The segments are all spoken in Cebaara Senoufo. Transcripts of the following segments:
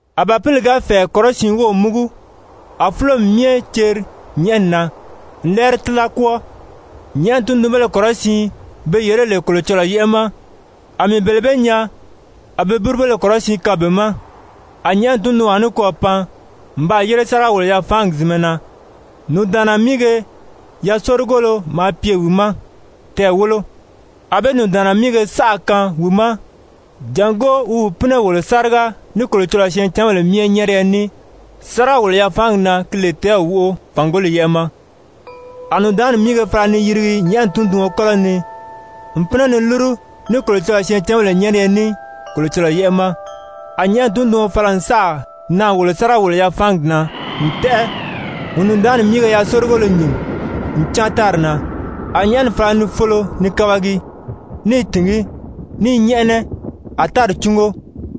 A Bàpili ga fɛ̀ɛ kɔrɔsiin wów múgu, a fúlomi myɛ ceri nyɛ̀ʔɛni na n lɛ́ɛri tíla kwɔ́ɔ. Nyɛ̀ʔɛni tundunbéle kɔrɔsiin be yèré lè Kolocɔlɔɔ yɛ́ʔɛ ma, a mii bele bee nyaa a be búrubéle kɔrɔsiin kaan be ma. A nyɛ̀ʔɛni tundunwaa nikwɔɔ pan n baa yére sáriga-wòlo-yafaangi zìnmɛ na. Nùndaanna míige yasorigolo maa pye wi ma, tɛɛ̀ wólo. A be nùndaanna míige saʔa kaan wi ma jàngó wi gi pínɛ wòlo sáriga ní Kolocɔlɔɔ syɛɛncanbèle myɛ nyɛ́ɛriyɛ ní sáriga-wòlo-yafaangi na ki lè tɛ́ɛw wóʔo, fàngoli yɛ́ʔɛ ma. A nùndaanni míige wírige fala ni yirigi nyɛ̀ʔɛni tunduɔn kɔ́lɔ ni n pínɛ ni lúru ní Kolocɔlɔɔ syɛɛncanbèle nyɛ́ɛriyɛ ní Kolocɔlɔɔ yɛ́ʔɛ ma. A nyɛ̀ʔɛni tunduɔn fala n sáà naà wòlo sáriga-wòlo-yafaangi na n tɛ́ʔɛ n nùndaanni míige yasorigolo nyìn n cáan tári na. A nyɛ̀ʔɛni fala ni folo ni kabagi, ní i tìngí, ní i nyɛ́ʔɛnɛ, a tári cúngo.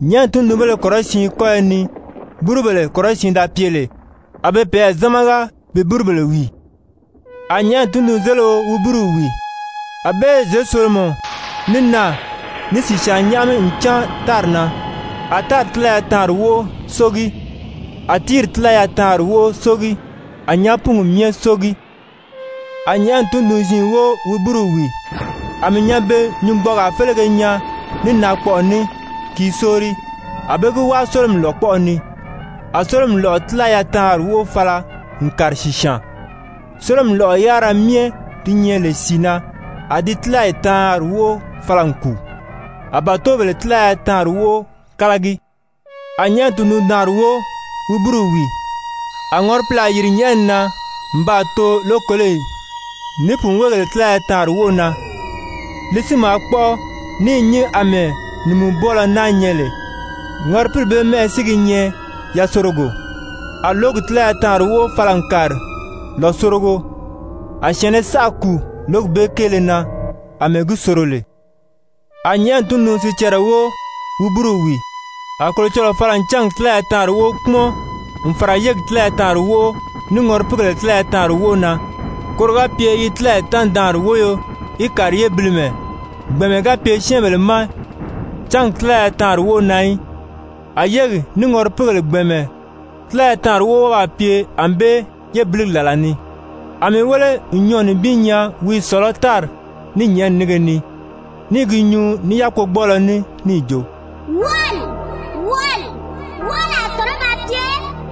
Nyɛ̀ʔɛni tundunbéle kɔrɔsiin kɔ́yɔ ni búrubèle kɔrɔsiin da pye lè, a be peyɛɛ zámaga bi búrubèle wìi. A nyɛ̀ʔɛni tundunzelio wi búruw wìi. A be zěsolomɔ, ní naà, ní sìsyaan nyáʔami n cáan tári na. A tári tílaya taanri wóʔo sógi, a tíiri tílaya taanri wóʔo sógi, a nyàápungi myɛ sógi. A nyɛ̀ʔɛni tundun-ziin wóo wi búruw wìi. A mii nyanbe-nyungbɔɔgaa félege nyaa ní naakpɔʔɔ ní, ki i sóori, a be gi wáa sólomi lòkpɔʔɔ ni. A sólomi lɔ̀ʔɔ tílaya taanri wóʔo fala n kàri sìsyaan, sólomi lɔ̀ʔɔ yárira myɛ di nyɛ lè sìi na, a di tílayi taanri wóʔo fala n kùu, a bàtobèle tílaya taanri wóʔo kálagi. A nyɛ̀ʔɛni tundun-daanri wóo wi búruw wìi. A ŋɔripilaa yìri nyɛ̀ʔɛni na n baa too lókoloyi, ní pùnweegèle tílaya taanri wóʔo na. Li si maa kpɔ́ʔɔ ní i nyín àmɛɛ nìmubwɔɔlɔ náa nyɛ lè. Ŋɔripili bee mɛ́ʔɛ si gi nyɛ Yasorogo. A lǒgi tílaya taanri wóʔo fala n kàri lòsorogo, a syɛ̀ɛnnɛ saʔa kùu lǒgi bee kéele na àmɛɛ gi soro lè. A nyɛ̀ʔɛni tundun-sicɛrɛ wóo wi búruw wìi. A Kolocɔlɔɔ fala n cángi tílaya taanri wóʔo kpúmɔn n fàra yégi tílaya taanri wóʔo, ní ŋɔripiigèle tílaya taanri wóʔo na, koro ga pye yi tílayi taanri-daanri wóyo í kàri yébilimɛ, gbɛ̀ɛnmɛ ga pye syɛ́ɛnbèle ma cángi tílaya taanri wóʔo na í, a yégi ní ŋɔripiigèle gbɛ̀ɛnmɛ tílaya taanri wóʔo wɔ́ɔ baa pye ànbée yébiligi làla ni. A mii wéle n nyɔɔ̀ nibin nyaa wi i sɔ̀lɔ́ tári ní nyɛ̀ʔɛni nínge ni, ní i gi nyuu ní yákpogbɔɔlɔ ní níì jo: «Wɔʔɔli, wɔʔɔli, wɔʔɔli a tɔ̀nɔ́ ba pye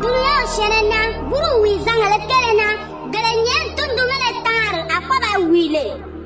dulunyanw syɛ̀ɛnnɛ na búruw wìizangèlē kéele na, gele nyɛ̀ʔɛni tundunbéle taanri a kɔ́ ba wìi lè.»